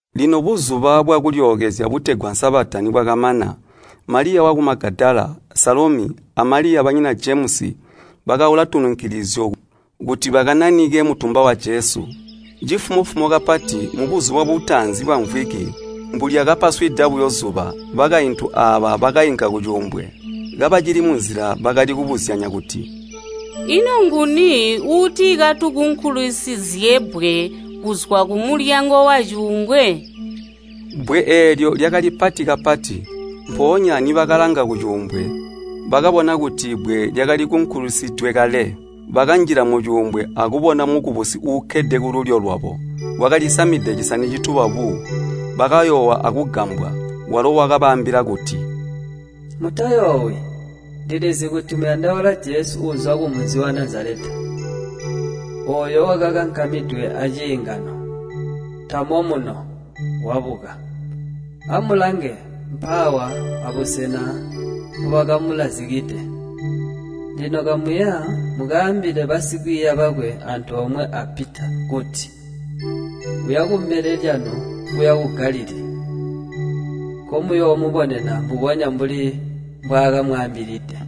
Lino Buzuba bwa Kulyookezya butegwa Sabata nibwakamana, Maliya waku Magadala, Salomi, a Maliya banyina Jemusi bakaula tununkilizyo kuti bakananike mutumba wa Jesu. Cifumo-fumo kapati mubuzuba butaanzi bwamvwiki, mbulyakapaswida buyo zuba, bakaintu aaba bakainka kucuumbwe. Kabacili munzila bakali kubuzyanya kuti, “Ino nguni uuti katukunkulisizye bbwe kuzwa kumulyango wacuumbwe?” Bbwe eelyo lyakali pati kapati. Mpoonya nibakalanga kucuumbwe, bakabona kuti bbwe lyakali kunkulisidwe kale. Bakanjila mucuumbwe akubona mukubusi uukkede kululyo lwabo, wakalisamide cisani cituba buu. Bakayoowa akugambwa. Walo wakabaambila kuti, “Mutayoowi, ndilizi kuti muyandaula Jesu uuzwa kumunzi wa Nazaleta, ooyo wakankamidwe aciingano. Tamo muno, wabuka! Amulange, mpaawa abusena mpobakamulazikide. Lino kamuya mukaambile basikwiiya bakwe antoomwe a Pita kuti, ‘Uya kumbele lyanu kuya ku Galilii, nkomuyoomubonena, mbubonya mbuli mbwaakamwaambilide!’”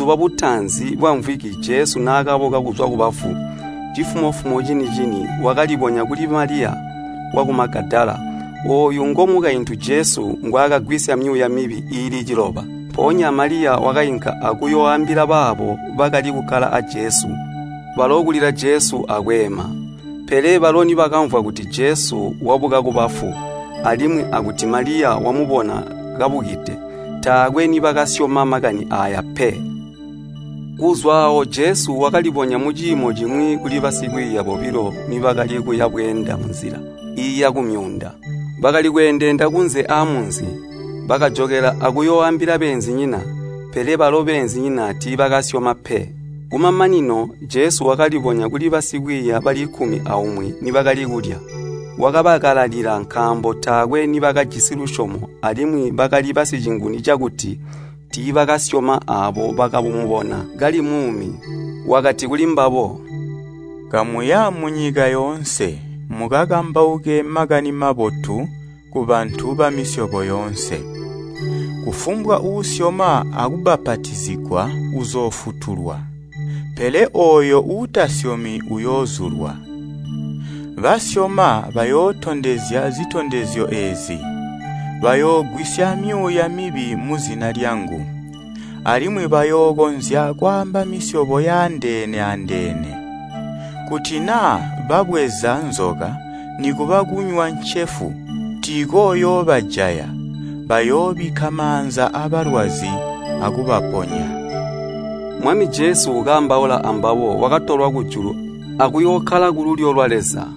Mubuzuba butaanzi bwamvwiki Jesu naakabuka kuzwa kubafu, cifumo-fumo cini-cini wakalibonya kuli Maliya waku Magadala, ooyu ngomukaintu Jesu ngwaakagwisya myuuya mibi iili ciloba. Mpoonya Maliya wakainka akuyooambila baabo bakali kukkala aa Jesu. Balo kulila Jesu akweema. Pele balo nibakamvwa kuti Jesu wabuka kubafu, alimwi akuti Maliya wamubona kabukide, taakwe nibakaasyoma makani aaya pe. Kuzwa aawo Jesu wakalibonya muciimo cimwi kuli basikwiiya bobilo nibakali kuya bweenda munzila iiya kumyuunda. Bakali kweendeenda kunze aa munzi. Bakajokela akuyooambila beenzinyina, pele balo beenzinyina tiibakasyoma pe. Kumamanino, Jesu wakalibonya kuli basikwiiya bali kkumi aumwi nibakali kulya. Wakabakalalila nkaambo taakwe nibakajisi lusyomo alimwi bakali basicinguni cakuti tiibakabasyoma aabo bakamubona kali muumi. Wakati kulimbabo, “Kamuya munyika yoonse, mukakambauke Makani Mabotu kubantu bamisyobo yoonse. Kufumbwa uusyoma akubbapatizigwa uzoofutulwa, pele ooyo uutasyomi uyoozulwa. Basyoma bayootondezya zitondezyo eezi, bayoogwisya myuuya mibi muzina lyangu, alimwi bayookonzya kwaamba misyobo yandeene-andeene, kuti naa babweza nzoka, nikuba kunywa ncefu, tiikooyoobajaya, bayoobikka maanza abalwazi akubaponya.” Mwami Jesu kaambaula ambabo wakatolwa kujulu akuyookkala kululyo lwa Leza.